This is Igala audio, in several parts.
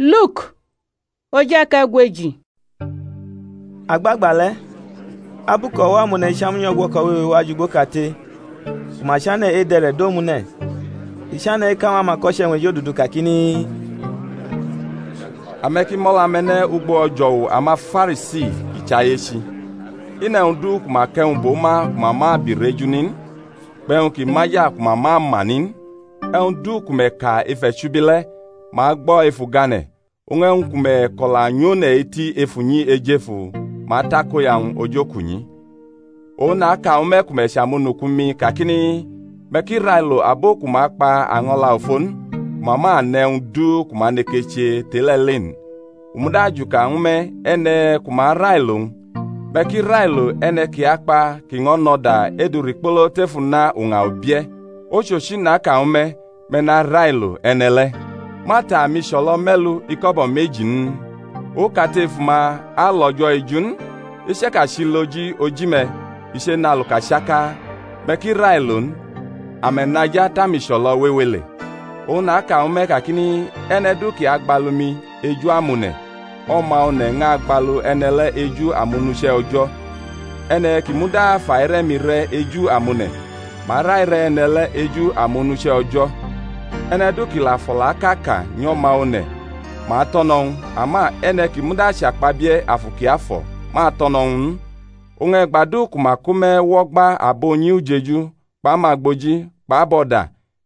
Nago ayechi-ma! Agbagba le̩, abu kʼo̩wo̩-amone̩ icham nyʼo̩gwo̩ko̩ wewe wa jʼugbokate ku ma chane̩ edʼe̩re̩ do omune̩, i chane̩ eka ñw amako̩che̩-wñ ejodudu kakini, Ame̩ ki mʼo̩la-me̩ ne̩ ugbo o̩jo̩wu amaFarisi kʼi chʼayechi. I nʼe̩wñ du ku ma kʼe̩wñ bʼo ma ku ma ma abi rʼeju ni n, kpʼe̩wñ kʼi maja ku ma ma ama ni n. E̩wñ du ku me̩ ka ef e̩chubi le̩, ma agbo̩ ef ugane̩; oñ e̩wñ ku me̩ ko̩la nyʼone̩ eti ef unyi eje-fu, ma atakoya-wñ ojokunyi. Oñ naka ñw me̩ ku me̩ chʼamonuku-mi, kakini, Me̩ ki railo abo ku ma kpa año̩la ofo n, ku ma ma ne̩ e̩wñ du ku ma neke che tʼe-le̩ le n. U muda ajuka ñw me̩ e̩ne̩ ku ma arailo-wñ; me̩ ki railo e̩ne̩ kʼi akpa kʼi ño̩ nʼo̩da edurikpolo tef una uña ubie̩; ochochi, naka ñw me̩, me̩ narailo e̩ne̩ le̩. Ma ta amicho̩lo̩ me̩lu iko̩bo̩ meji n? okate ef uma alʼO̩jo̩ eju n. I chaka chʼiloji oji-me̩ i chenʼaluka chaka. Me̩ ki railo n: ame̩ nʼaja tʼamicho̩lo̩ wewe le̩. Oñ naka ñw me̩ kakini, E̩ne̩ du ki agbalu mi eju amone̩. O̩ma One̩ ñʼagbalu e̩ne̩ le̩ eju amonuche̩ O̩jo̩. E̩ne̩ ki muda fʼaire̩-mi re̩ eju amone̩, ma arʼaire̩ e̩ne̩ le̩ eju amonuche̩ O̩jo̩. E̩ne̩ du kʼi la fʼo̩laʼka ka nyʼO̩ma One̩, ma atʼo̩ no̩ ñw u; ama e̩ne̩ ki muda achakpabie̩ Afu Kiafo̩ ma atʼo̩ no̩ ñw u n. Oñ e̩gba du ku ma ko me̩ wʼo̩gba abʼunyi ujeju kpʼamagboji kpʼabo̩da,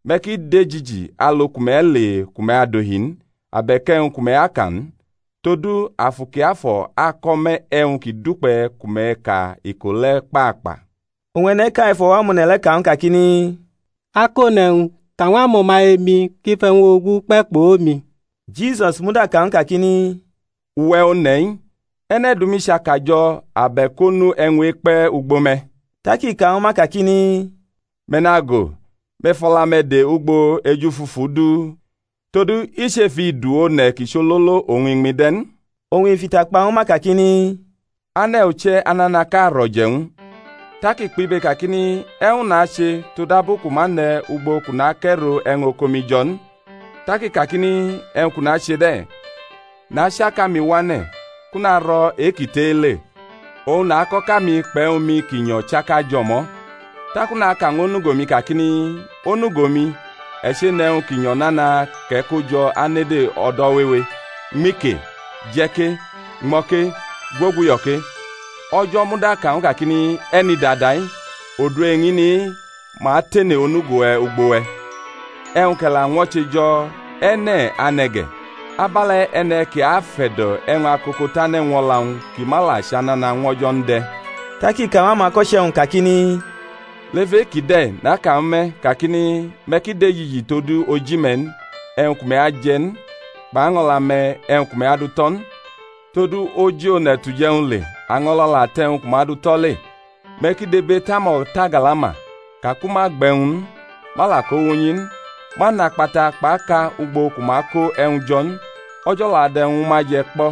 me̩ ki dejiji alu ku me̩ ale ku me̩ adohi n, abe̩k e̩wñ ku me̩ aka n: todu Afu Kiafo̩ ako̩ me̩ e̩wñ ki dukpe̩ ku me̩ ka iko le̩ kpakpa. Oñ e̩ne̩ʼka ef o̩wo̩-amone̩ le̩ ka ñw u kakini, Akone̩wñ, ka ñw o̩maye-mi kʼi fʼe̩wñ-ogu kpe̩ kpʼomi. Jisusi muda ka ñw u kakini, Uwe̩ one̩-i, e̩ne̩ dʼumi chʼakajo̩ abe̩k onu e̩wñ-e̩kpe̩ ugbo me̩? Tak i ka ñw ma kakini, Me̩ nago, me̩ fʼo̩la-me̩ de ugbo ejufufu du: todu i chʼef idu-one̩ kʼi chʼololo oñ iñmi-wñ de̩ n. Oñ i fʼita kpa ñw ma kakini, Ane̩ uche̩ ananaʼka rʼo̩je̩ ñw u: tak i kpʼibe kakini, E̩wñ nache, todabu kʼu ma ne̩ ugbo kʼu nakʼe̩ro e̩wñ oko-mi jo̩ n? Tak i kakini, E̩wñ kʼu nache de̩: nachi akami wane̩, kʼu naro̩ e-ki tʼe-i le; oñ nakʼo̩ka-mi kpʼe̩wñ-mi ki nyo̩ chaka jʼo̩mo̩. Taku naka ñw onugo-mi kakini, Onugo-mi, e̩ che̩nʼe̩wñ ki nyo̩ nana kʼe̩ ko jo̩ anede o̩do̩ wewe; ñmi ke, je̩ ke, ñmo̩ ke, gwoguyo̩ ke. O̩jo̩ muda ka ñw u kakini, E̩nidada-i! odu eñini-i ma tene onugo-we̩ ugbo we̩, e̩wñ kʼe̩ la ñwo̩che jo̩, e̩ne̩ ane̩ ge̩? Abe̩le̩ e̩ne̩ ki afe̩do̩ e̩wñ akoko tane̩ ñw o̩la-wñ kʼi ma la chʼanana ñw O̩jo̩ n de̩. Tak i ka ñw amako̩che̩-wñ kakini, Lef e-kide̩ naka ñwu me̩, kakini, Me̩ ki dejiji tod oji-me̩ n, e̩wñ ku me̩ aje̩ n; kpʼaño̩la-me̩, e̩wñ ku me̩ adu tʼo̩ n. Todu oji one̩ tʼuje̩wñ le, año̩la la tʼe̩wñ ku ma du tʼo̩ le. Me̩ ki dibetʼamo̩tagalama, ka ku ma gbe̩ e̩wñ n, ma la ko wʼunyi n; ma nʼakpata kpʼaka ugbo ku ma ko e̩wñ jo̩ n; O̩jo̩ la dʼe̩wñ ñwu ma je̩ kpo̩;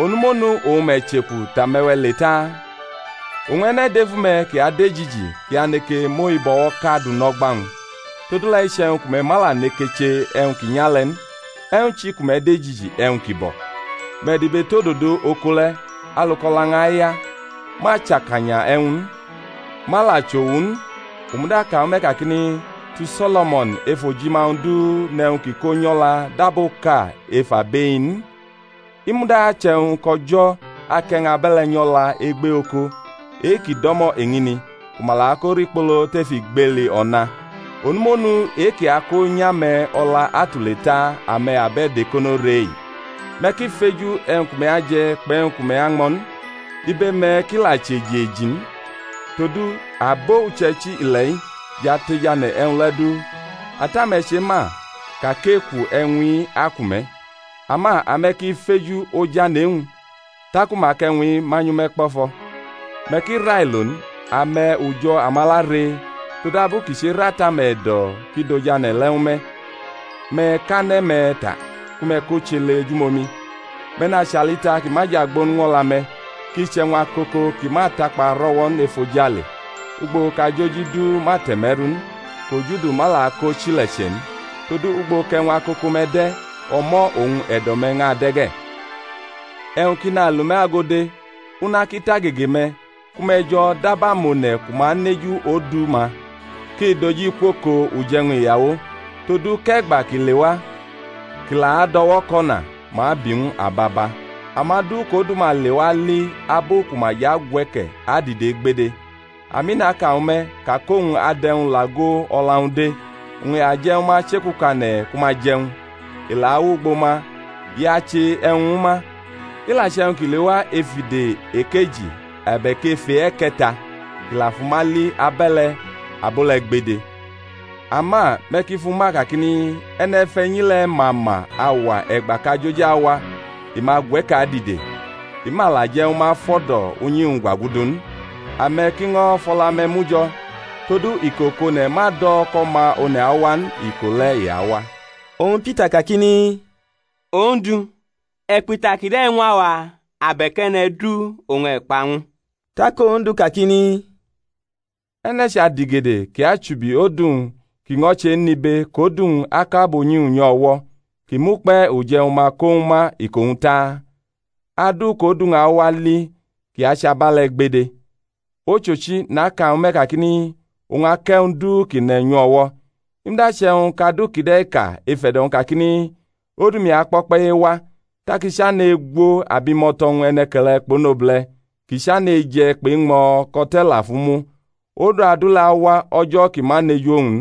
onumonu oñ me̩ chʼeku tʼame̩we̩ le taa? Oñ e̩ne̩ dʼef ume̩ kʼi adejiji-i kʼi aneke mʼohibo̩wo̩ʼka du nʼo̩gba-wñ? Todule̩ iche̩wñ ku me̩ ma la neke che e̩wñ ki nya le̩ n, e̩wñ chi ku me̩ dejiji e̩wñ ki bo̩? Me̩ dibetʼododo oko le̩, alu kʼo̩la-wñ aya; ma chʼakanya e̩wñ n, ma la chʼowu n; u muda ka ñwu me̩ kakini, Tu So̩lo̩mo̩n ef ojima-wñ du nʼe̩wñ kʼi ko nyʼo̩la dab oka ef abʼe-i n. I muda che̩wñ kʼO̩jo̩ kʼe̩wñ abe̩le̩ nyʼo̩la egbe oko e-kʼi do̩mo̩ eñini, ku ma la ko rikpolo tef igbeli o̩na; onumonu e-kʼi ako nyʼame̩ o̩la atule taa ame̩ abe̩do̩-ekono re-i! Me̩ ki feju e̩wñ ku me̩ aje̩ kpʼe̩wñ ku me̩ añmo̩ n; ibe-me̩ ki la chʼeji eji n. Todu abo uche̩ichi ile̩-i jʼatejane̩ e̩wñ le̩ du; Ata-me̩ chema ka kʼeku e̩wñ-i aku me̩. Ama ame̩ ki feju ojane̩ e-wñ, taku ma akʼe̩wñ-i manyʼu ñwu me̩ kpo̩fo̩. Me̩ ki railo n, ame̩ ujo̩ amala ree, todabu kʼi cherʼAta-me̩ e̩do̩ kʼi dʼojane̩ le̩ ñwu me̩. Me̩ kʼane̩-me̩ ta, ku me̩ kʼo chʼele ejumomi; me̩ nachʼalita ki ma jʼagbo n ñw o̩la-me̩, kʼi chʼe̩wñ akoko ki ma atakpa rʼo̩wo̩ n efojale, ugbo kʼajoji du ma te̩me̩ru n, kʼojudu ma la akʼo chile̩che̩ n. Todu ugbo kʼe̩wñ akoko-me̩ de̩, o̩mo̩ oñ e̩do̩-me̩ ñʼade̩ ge̩. E̩wñ ki nalʼume̩ ago de, una ki tʼagege-me̩, ku me̩ jo̩ dab amone̩ ku ma aneju odu-ma kʼi doji kwʼoko uje̩wñ iyawo, todu kʼe̩gba kʼi lewa kʼi la ado̩woko̩na, ma abi ñw u ababa. Amadu kʼodu-ma lewa ali abu ku ma jʼagwe̩ke̩ adide gbede; ami naka ñwu me̩, ka kʼowñ adʼe̩wñ lʼago o̩la-wñ de, oñ i aje̩ ñwu ma chekukane̩ ku ma jʼe̩wñ, i la awʼugbo ma i ache e̩wñ ñwu ma. I la che̩wñ kʼi lewa ef ide ekeji abe̩k ef e-e̩ke̩ta, kʼi la fʼuma li abe̩le̩, abo le̩ gbede. Ama me̩ ki fʼu ma kakini, E̩ne̩fe̩nyi le̩ ma ma auwa e̩gba kʼajoji awa i ma gwe̩ke̩ adide, i ma la je̩ ñwu ma fʼo̩do̩ unyi-wñ gwagudu n. Ame̩ ki ño̩ fʼo̩la-me̩ mu jo̩, todu iko kʼone̩ ma do̩ kʼO̩ma One̩ awa n, iko le̩ i awa. Oñ Pita kakini, Ondu, e̩ kpʼita kide̩ ñw awa, abe̩k e̩ne̩ du oñ e̩ kpa ñw u? Tak Ondu kakini, E̩ne̩ chʼadigede kʼi achubi odu-wñ kʼi ño̩ chenʼibe kʼodu-wñ akʼabunyi-wñ nyʼu o̩wo̩ kʼi mʼukpe̩ uje̩wñ-ma ko ñwu ma iko-wñ taa? Adu kʼodu-wñ awa li kʼi achʼabe̩le̩ gbede. Ochochi, naka ñw me̩ kakini, Owñ akʼe̩wñ du ki ne̩ nyʼu o̩wo̩. I muda che̩wñ kʼadu kide̩ ka ef e̩do̩-wñ kakini, Odu-mi akpo̩kpe̩ ewa, tak i chane̩ egwo abimo̩to̩-wñ e̩ne̩ke̩le̩ kpʼonobule̩, kʼi chane̩ eje̩ kpʼeñmo̩ kʼo̩te̩ la fʼu mu, odu adu le̩ awa o̩jo̩ kʼi ma neju owñ n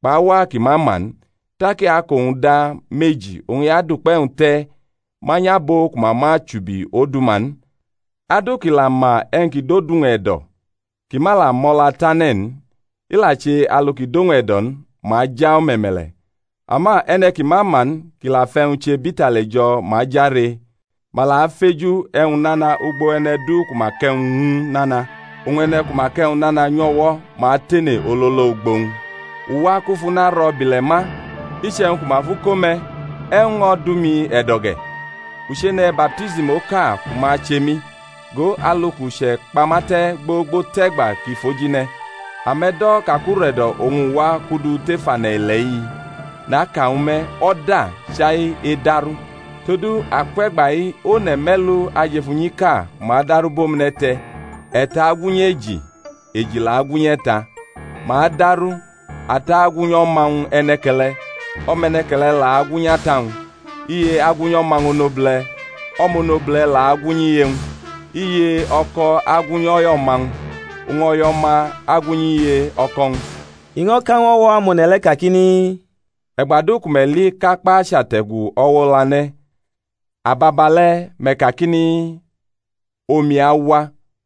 kpʼauwa kʼi ma ma n, tak i akʼo-wñ da meji, oñ i adʼukpe̩-wñ te̩ manyʼabo ku ma ma chubi odu-ma n. Adu ki la ma e̩wñ ki dʼodu-wñ e̩do̩, kʼi ma la mo̩la tane̩ n, i la che alu ki dʼowñ e̩do̩ n, ma aja o̩me̩me̩le̩; ama e̩ne̩ ki ma ma n, kʼi la fʼe̩wñ che bʼitali jo̩ ma aja ree. Ma la afeju e̩wñ nana ugbo e̩ne̩ du ku ma kʼe̩wñ ñw u nana, oñ e̩ne̩ ku ma kʼe̩wñ nana nyʼu o̩wo̩, ma atene ololo ugbo-wñ. U wa kʼu fʼuna ro̩ bʼile̩ ma; iche̩wñ ku ma fʼu ko̩ me̩, e̩wñ ño̩ dʼumi e̩do̩ ge̩? U chene̩ baptism oka ku ma ache mi, go alu kʼu chʼe̩kpama te̩ gbogbo tʼe̩gba ki fʼoji ne̩. Ame̩ do̩ ka kʼure̩do̩ oñ u wa kʼu du tef ane̩-ile̩-i? Naka ñw me̩, O̩da; chai edaru. Todu akwe̩gba-i one̩ me̩lu ajʼef unyiʼka ku ma daru bʼomune̩ te̩; e̩ta agwunyʼeji, eji la agwunyʼe̩ta. Ma adaru, ata agwunyʼo̩ma-wñ e̩ne̩ke̩le̩, o̩mʼe̩ne̩ke̩le̩ la agwunyʼata-wñ; iye agwunyʼo̩ma-wñ onobule̩, o̩mʼonobule̩ la agwunyʼiye-wñ; iye-o̩ko̩ agwunyʼo̩yʼo̩ma-wñ, oñ o̩yʼo̩ma agwunyʼiye-o̩ko̩-wñ. I ño̩ ka ñw o̩wo̩-amone̩ le̩ kakini, E̩gba du ku me̩ li kʼakpa achate̩gu o̩wo̩ o̩lane̩, ababale̩ me̩ kakini, Omi awa;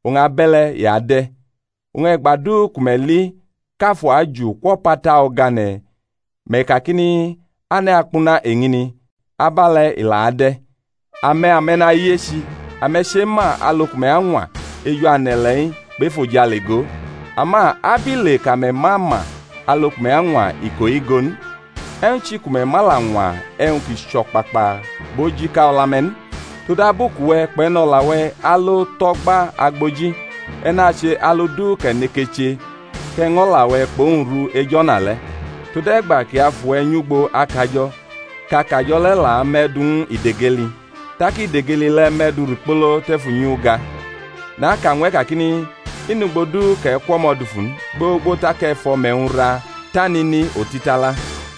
oñ abe̩le̩ i ade̩. Oñ e̩gba du ku me̩ li kʼafu aju kwʼo̩pata o̩gane̩ me̩ kakini, Ane̩ akpuna eñini; abe̩le̩ i la ade̩. Ame̩, ame̩nayechi! Ame̩ chema alu ku me̩ añwa eju ane̩-ile̩-i kpʼefojale go; ama abile kʼame̩ ma ma alu ku me̩ añwa iko-i go n? E̩wñ chi ku me̩ ma la ñwa e̩wñ ki chʼo̩kpakpa kpʼojika o̩la-me̩ n? Todu abu kʼuwe̩ kpʼe̩no̩la-we̩ alo tʼo̩gba agboji, e̩ nache alu du kʼe̩ neke che kʼe̩ ñʼo̩la-we̩ kpʼowñ ru ej o̩na le̩, tode̩gba kʼi afʼuwe̩ nyʼugbo akajo̩, kʼakajo̩ le̩ la mʼe̩ du ñw idegeli tak idegeli le̩ mʼe̩ du rikpolo tef unyiuga. Naka ñw e̩ kakini, I nʼugbo du kʼe̩ kwʼo̩mo̩ dufu n gbogbo tak e̩ fʼo̩me̩-wñ ra tʼanini otitala.